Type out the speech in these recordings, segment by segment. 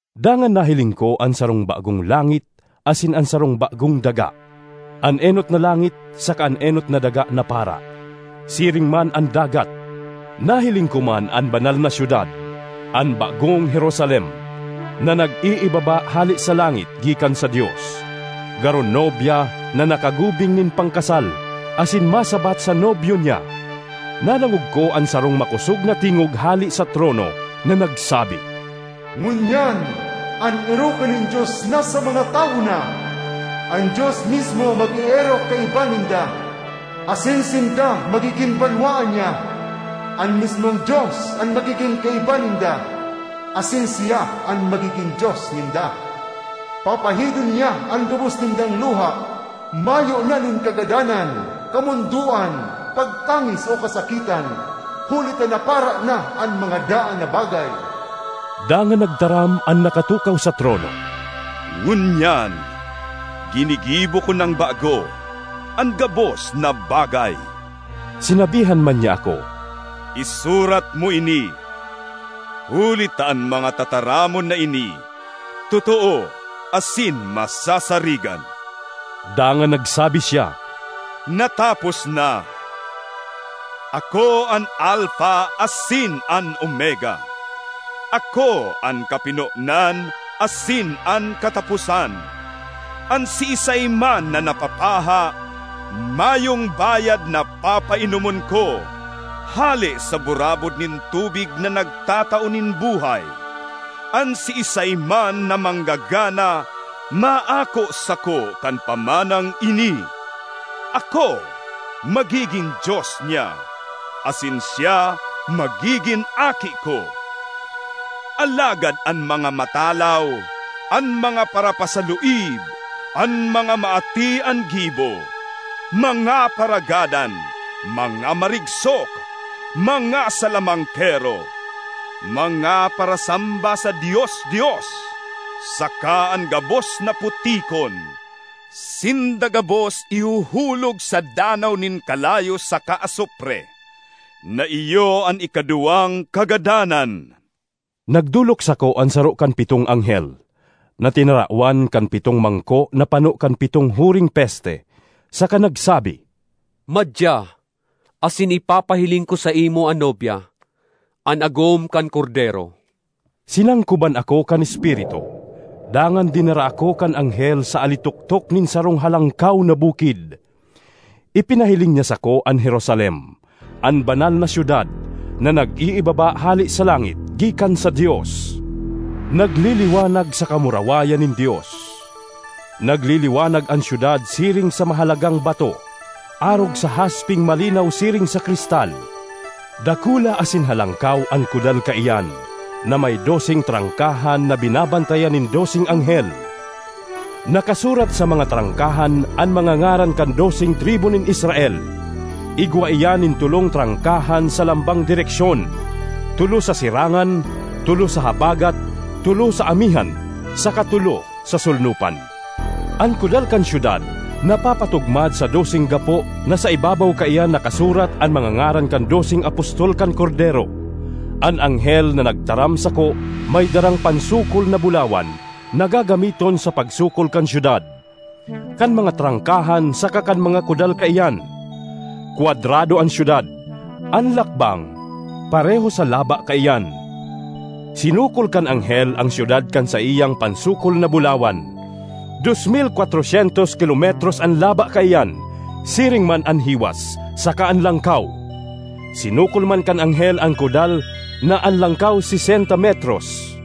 Dangan nahiling ko an sarong bagong langit asin an sarong bagong daga. An enot na langit saka an enot na daga napara, siring man an dagat. Nahiling ko man an Banal na Syudad, an bagong Jerusalem, na nag-iibaba hale sa langit gikan sa Dios, garo nobya na nakagubing nin pangkasal asin masabat sa nobyo niya. Nadangog ko an sarong makosog na tingog hale sa trono na nagsabi, “Ngunyan an erokan nin Dios nasa mga tawo na! An Dios mismo mag-eerok kaiba ninda asin sinda magigin banwaan niya. An mismong Dios an magigin kaiba ninda asin siya an magigin Dios ninda. Papahidon niya an gabos nindang luha. Mayo na nin kagadanan, kamondoan, pagtangis o kasakitan, huli ta napara na an mga daan na bagay.” Dangan nagtaram an nakatukaw sa trono, “Ngunyan ginigibo ko nang bago an gabos na bagay!” Sinabihan man niya ako, “Isurat mo ini, huli ta an mga tataramon na ini totoo asin masasarigan.” Dangan nagsabi siya, “Natapos na! Ako an Alfa asin an Omega; ako an kapinonan asin an kataposan. An siisay man na napapaha, mayong bayad na papainomon ko hale sa burabod nin tubig na nagtatao nin buhay. An siisay man na manggagana, maako sako kan pamanang ini: ako magigin Dios niya asin siya magigin aki ko. Alagad an mga matalaw, an mga parapasaluib, an mga maati an gibo, mga paragadan, mga marigsok, mga salamangkero, mga parasamba sa dios-dios, saka an gabos na putikon—sinda gabos ihuhulog sa danaw nin kalayo saka asupre, na iyo an ikaduwang kagadanan.” Nagdolok sako an saro kan pitong anghel, na tinarawan kan pitong mangko na pano kan pitong huring peste, saka nagsabi, “Madya, asin ipapahiling ko saimo an Nobya, an agom kan Kordero.” Sinangkoban ako kan Espiritu, dangan dinara ako kan anghel sa alitoktok nin sarong halangkaw na bukid. Ipinahiling niya sako an Jerusalem, an Banal na Syudad na nag-iibaba hale sa langit gikan sa Dios, nagliliwanag sa kamurawayan nin Dios. Nagliliwanag an syudad siring sa mahalagang bato, arog sa haspeng malinaw siring sa kristal. Dakula asin halangkaw an kudal kaiyan, na may doseng trangkahan na binabantayan nin doseng anghel. Nakasurat sa mga trangkahan an mga ngaran kan doseng tribu nin Israel. Igwa iyan nin tolong trangkahan sa lambang direksyon: tolo sa sirangan, tolo sa habagat, tolo sa amihan saka tolo sa solnopan. An kudal kan syudad napapatugmad sa doseng gapo na sa ibabaw kaiyan nakasurat an mga ngaran kan doseng apostol kan Kordero. An anghel na nagtaram sako may darang pansukol na bulawan na gagamiton sa pagsukol kan syudad, kan mga trangkahan saka kan mga kudal kaiyan. Kwadrado an syudad; an lakbang pareho sa laba kaiyan. Sinukol kan anghel an syudad kan saiyang pansukol na bulawan: dos mil kwatro syentos kilometros an laba kaiyan, siring man an hiwas, saka an langkaw. Sinukol man kan anghel an kudal na an langkaw sesenta metros,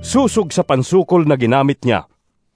sosog sa pansukol na ginamit niya.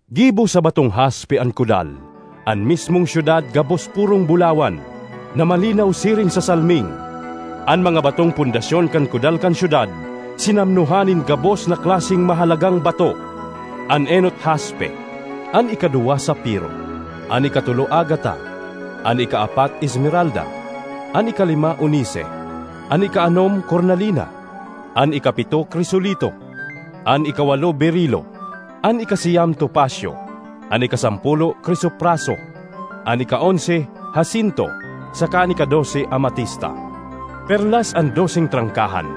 Gibo sa batong haspe an kudal; an mismong syudad gabos purong bulawan, na malinaw siring sa salming. An mga batong pundasyon kan kudal kan syudad sinamnohan nin gabos na klaseng mahalagang bato: an enot haspe, an ikaduwa safiro, an ikatolo agata, an ikaapat esmeralda, an ikalima onise, an ikaanom kornalina, an ikapito krisolito, an ikawalo berilo, an ikasiyam topasyo, an ikasampolo krisopraso, an ikaonse hasinto, saka an ikadose amatista. Perlas an doseng trangkahan;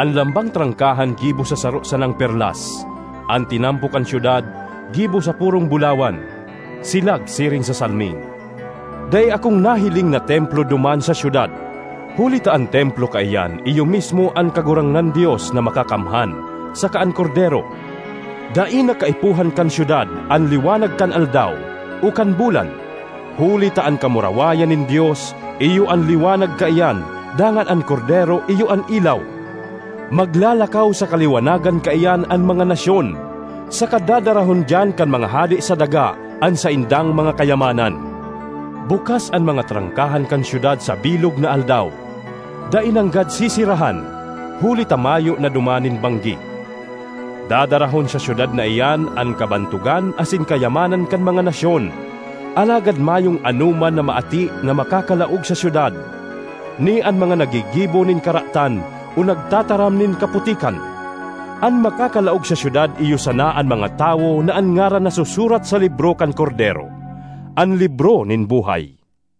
an lambang trangkahan gibo sa saro sanang perlas. An tinampo kan syudad gibo sa purong bulawan, silag siring sa salming. Dai akong nahiling na templo duman sa syudad, huli ta an templo kaiyan iyo mismo an Kagurangnan Dios na Makakamhan, saka an Kordero. Dai na kaipuhan kan syudad an liwanag kan aldaw o kan bulan, huli ta an kamurawayan nin Dios iyo an liwanag kaiyan dangan an Kordero iyo an ilaw. Maglalakaw sa kaliwanagan kaiyan an mga nasyon, saka dadarahon diyan kan mga hade sa daga an saindang mga kayamanan. Bukas an mga trangkahan kan syudad sa bilog na aldaw; dai nanggad seserahan, huli ta mayo na duman nin banggi. Dadarahon sa syudad na iyan an kabantogan asin kayamanan kan mga nasyon. Alagad mayong anoman na maati na makakalaog sa syudad, ni an mga naggigibo nin karatan o nagtataram nin kaputikan. An makakalaog sa syudad iyo sana an mga tawo na an ngaran nasusurat sa libro kan Kordero—an libro nin buhay.